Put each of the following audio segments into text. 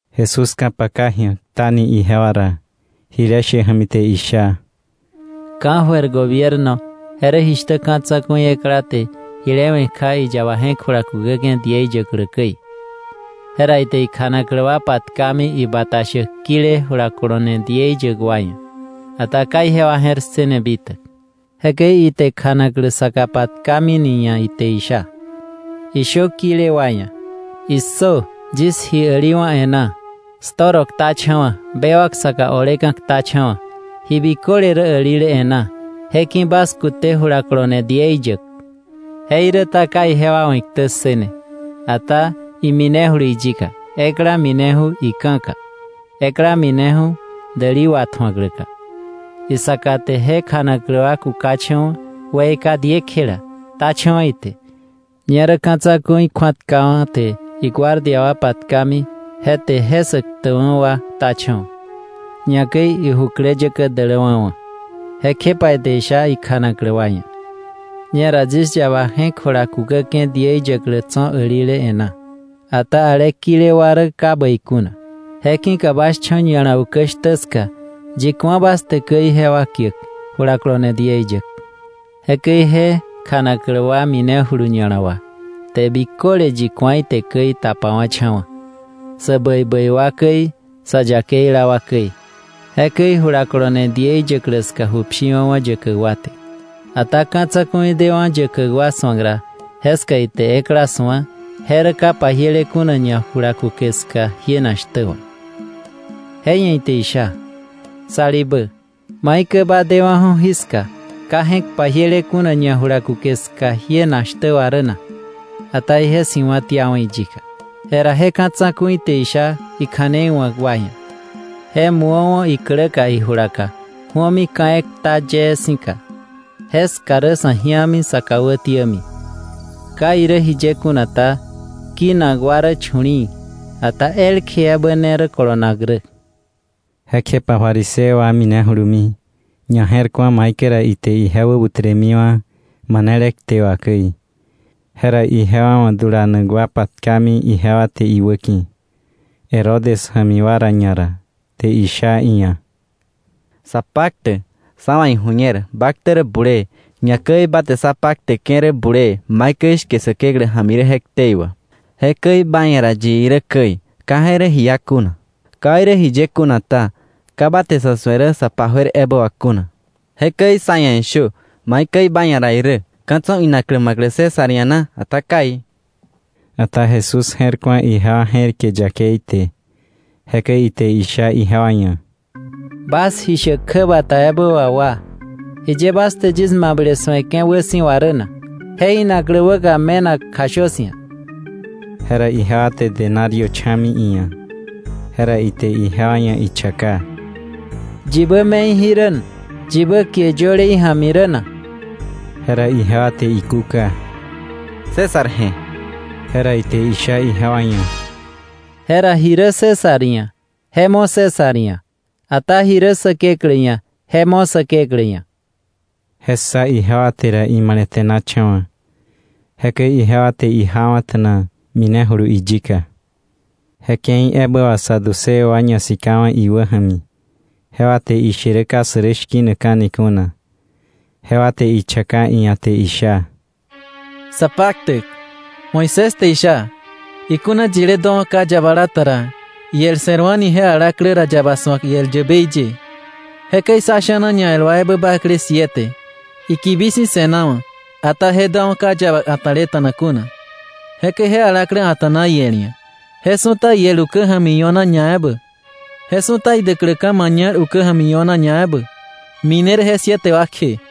Jesús ka̱paka ji̱a, ktani ijewa ra jile she ja̱mi te isha: “Ka̱jöir gobierno je rä jishtä ka̱ tsa̱ku̱i ekla te jile we̱ kja iyaba je̱k jula kukäke̱ diei yäklä käi. Jera ite ikjanaklä wa patkami ibata shäk kile jula kolone diei yäk wa ia̱, ata ka ijewa je̱r ssëne bitäk. Jekäi ite kjanaklä saka patkami ni ia̱ ite isha: ‘Ishö kile wa ia̱: ¡Issö! Yis ji äliwa̱ e̱ná, yis toro ktacha̱wa̱, bewak saka oleka̱ ktacha̱wa̱. Ji biköle rä älile e̱ná; je ki̱ bas kute jula kolone diei yäk.’ Jeiräta ka jewa wa̱ iktä ssë ne, ata minejulu iyika, ekla mineju̱ ika̱ ka, ekla mineju̱ idäli watju̱akläka; isaka te je kjanaklä wa kukacha̱wa̱, weika diekjela, ktacha̱wa̱ ite. Ñerä ka̱ tsa̱ku̱i kju̱atkawa̱, te iguardia wa patkami, je te je sä ktäkwa̱ wa ktacha̱wa̱, ñakäi ijukläyäkä däläwa̱ wa̱. Jekjepa ite isha ikjanaklä wa ia̱: ‘Ñera yis yaba je̱k jula kukäke̱ diei yäklä tso̱ älile e̱ná; ata ale kile wa rä ka bäi kuna. ‘Je ki̱ka bas cho̱ ña̱la ukä shtä ska, yi ku̱a bas te käi jewa kiäk jula kolone diei yäk.’ Jekäi je kjanaklä wa minejulu ña̱la wà, te biköle yi ku̱a ite käi tapawa̱cha̱wa̱, sä bäi bäi wa käi, sa yakeila wa käi. Jekäi jula kolone diei yäklä ska ju pshiwa̱wa̱ yäkäk wa te. “Ata ka̱ tsa̱ku̱i dewa̱ju̱ yäkäk wa su̱ak ra, jeska ite ekla su̱a, je rä ka pajiele kuna ñajulakuke ska jienak shtä wà. Je ia̱ ite isha: ‘Salibä, ¿maikäi ba dewa̱ju̱ jiska, ka je̱k pajiele kuna ñajulakuke ska jienak shtä wà rä na?’ Ata ije si̱wa̱tiawa̱ iyika. Jera je ka̱ tsa̱ku̱i te isha ikja̱nei wa̱k wa ia̱: ‘Je mu̱owa̱ ikläka ijulaka, ju̱omi ka̱ ekta yee si̱ka, jeska rä sa̱ ji̱ami, sä kà wätiämi.’ Ka irä jiye kuna ta, kinak wa rä chu̱li̱i̱, ata elkje ebä ne rä kolonak rä.” Jekjepa fariseo wa minejulumi, ñaje̱rku̱a maikäi ra ite ije wäbutremiwa̱ manele kte wà käi. Jera ijewa wa̱ dulanak wa patkami ijewa te iwäki̱, Herodes ja̱mi wa ra ñara; te isha iia̱: —Sapaktäk, sá wa̱ iju̱ñer ba ktä rä bulee, ñakäi ba te sa pakteke̱ rä bulee maikäi shke Säkeklä ja̱mi rä je ktei wà, jekäi ba ia̱ ra yi irä käi, ka je rä ji iá kuna. Ka irä jiye kuna ta, ka ba te sa̱ su̱e rä sa pa juer ebä wà kuna. Jekäi sá ia̱ ishö, maikäi ba ia̱ ra irä: ¿Ka̱ tso̱ inaklä ma̱klä César ia̱ na, ata kai? Ata Jesús je̱r ku̱a ijewa je̱rike yakei te, jekäi ite isha ijewa ia̱: —Bas ji shäk kjäbata ebä wà wa, ¿jiye bas te yis mable su̱eke̱ wäsi̱wa rä na? Je inaklä wäka me̱nak kjashö 'sia̱. Jera ijewa te denario cha̱mi iia̱, jera ite ijewa ia̱ ichaka: —¿Yibä me̱i jí rä, yibä kie yöle ija̱mi rä na? Jera ijewa te ikúka: —César je̱. Jera ite isha ijewa ia̱: —Jera ji rä César ia̱, je mo César ia̱; ata ji rä Säkeklä ia̱, je mo Säkeklä ia̱. Je ssa ijewa te ra, imale̱te̱nacha̱wa̱. Jekäi ijewa te ijawa̱ta̱na, minejulu iyika. Je ke̱i ebä wà saduceo wa ñasikawa̱ iwä ja̱mi. Jewa te ishe rä ka sä rä shki̱nakka̱ni kuna; jewa te ichaka iia̱, te isha: —Sapaktäk, Moisés te isha: ‘Ikuna yile duawa̱ ka yabala ta ra, iel se̱rwa̱ni je alaklä ra, yaba su̱ak iel yäbei ye.’ Jekäi sá sha̱na ñael wa ebä bakle siete; ikibi si̱ se̱nawa̱, ata je duawa̱ ka yäbei a̱ta̱leta̱na kuna, jekäi je alaklä a̱ta̱na iel ia̱. Je su̱ta iel ukä ja̱mi io̱na ñaebä, je su̱ta idäkläka̱ mañal ukä ja̱mi io̱na ñaebä, mine rä je siete wa kje.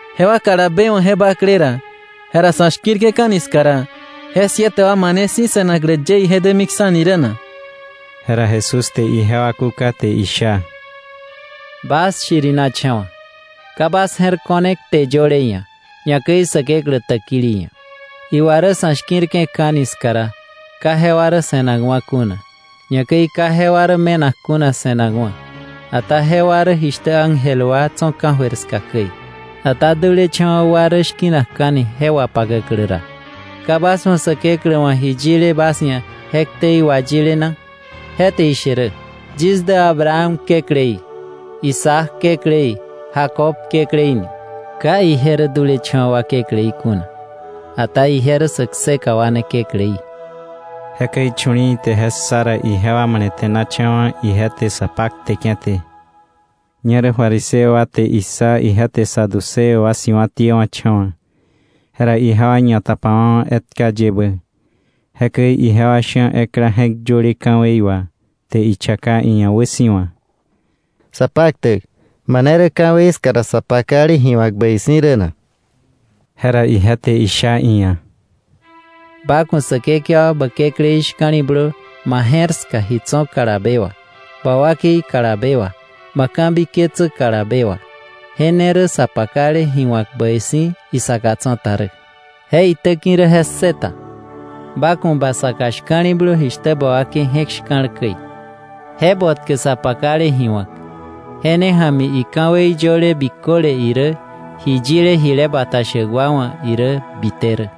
Jewa kalabe wa̱ je bakle ra, jera sa̱ shki̱rke̱ka̱ni ska ra, ¿je siete wa mane si̱ se̱naklä ye ije dämiksa̱ni rä na? Jera Jesús te ijewa kúka te isha: —Bas shirinacha̱wa̱. Ka bas je̱r ko̱ne kte yöle ia̱, ñakäi Säkeklä täkili ia̱. Iwa rä sa̱ shki̱rke̱ka̱ni ska ra, ka jewa rä se̱nakwa̱ kuna, ñakäi ka jewa rä me̱nak kuna se̱nakwa̱, ata jewa rä jishtä ángel wa tso̱ ka̱jöir ska käi. Ata dulecha̱wa̱ wa rä shki̱nakka̱ni je wapakäklä ra, ¿ka bas wa̱ Säkeklä wa̱ ji yile bas ia̱ je ktei wayile na? Je te ishe rä: ‘Yis dä Abraham Kekläí, Isaac Kekläí, Jacob Kekläí ni.’ Ka ije rä dulecha̱wa̱ wa Kekläí kuna, ata ije rä sä kseka wa ne Kekläí. Jekäi chu̱li̱i̱ te je ssa ra, ijewa male̱te̱nacha̱wa̱, ije te sa pakteke̱ te. Ñerä fariseo wa te issa ije te Saduceo wa si̱wa̱tiewa̱cha̱wa̱, jera ijewa ñatapawa̱wa̱ etka yebä. Jekäi ijewa sha̱ ekla je̱k yöle ka̱wei wà te ichaka iia̱ wäsi̱wa: —Sapaktäk, ¿mane rä ka̱wei ska ra sa pakale ji wa̱k bäi si̱ rä na? Jera ije te isha iia̱: —‘Ba ku̱ Säkekewa ba Kekläí shka̱li̱blö ma je̱r ska ji tso̱ kalabe wà, ba wakei kalabe wà, bä ka̱biketsä kalabe wà.’ Je ne rä sa pakale ji wa̱k bäi si̱ rä, isaka tsa̱ta rä. Je itäki̱ rä je ssëta: ‘Ba ku̱ ba saka shka̱li̱blö jishtä ba wakei je̱k shka̱l käi.’ Je botkä sa pakale ji wa̱k, je ne ja̱mi ika̱wei yöle biköle irä ji yile jile bata shäk wa wa̱ irä bite rä.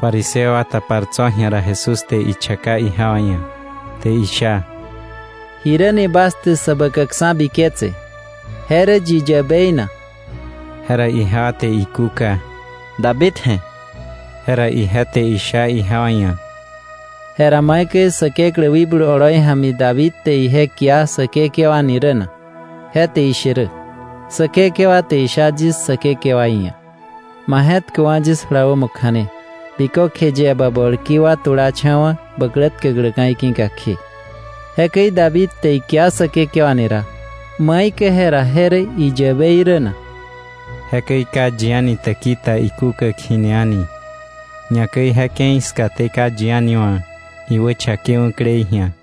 Fariseo wa tapar tso̱ ji̱a ra, Jesús te ichaka ijewa ia̱, te isha: —¿Jiräni bas te Säbäkäkksa̱ biketse, je rä yi yäbei na? Jera ijewa te ikúka: —David je̱. Jera ije te isha ijewa ia̱: —Jera ¿maikäi Säkeklä wikblu oloi ja̱mi David te ije kia Säkekewa ni rä na? Je te ishe rä: ‘Säkekewa te isha yis Säkekewaí ia̱: Ma je̱tköwa̱ yis jula wämo kja̱ne, bikökje yie bä bolki wa tulacha̱wa̱ bä klä tkäkläka̱ iki̱ka kje.’ Jekäi David te ikia Säkekewa ni ra, ¿maikäi jera je rä iyäbei rä na? Jekäi ka yi a̱ni täki ta ikúkäk jini a̱ni, ñakäi je ke̱i skaté ka yi a̱ni wa̱ iwächakewa̱klei ji̱a.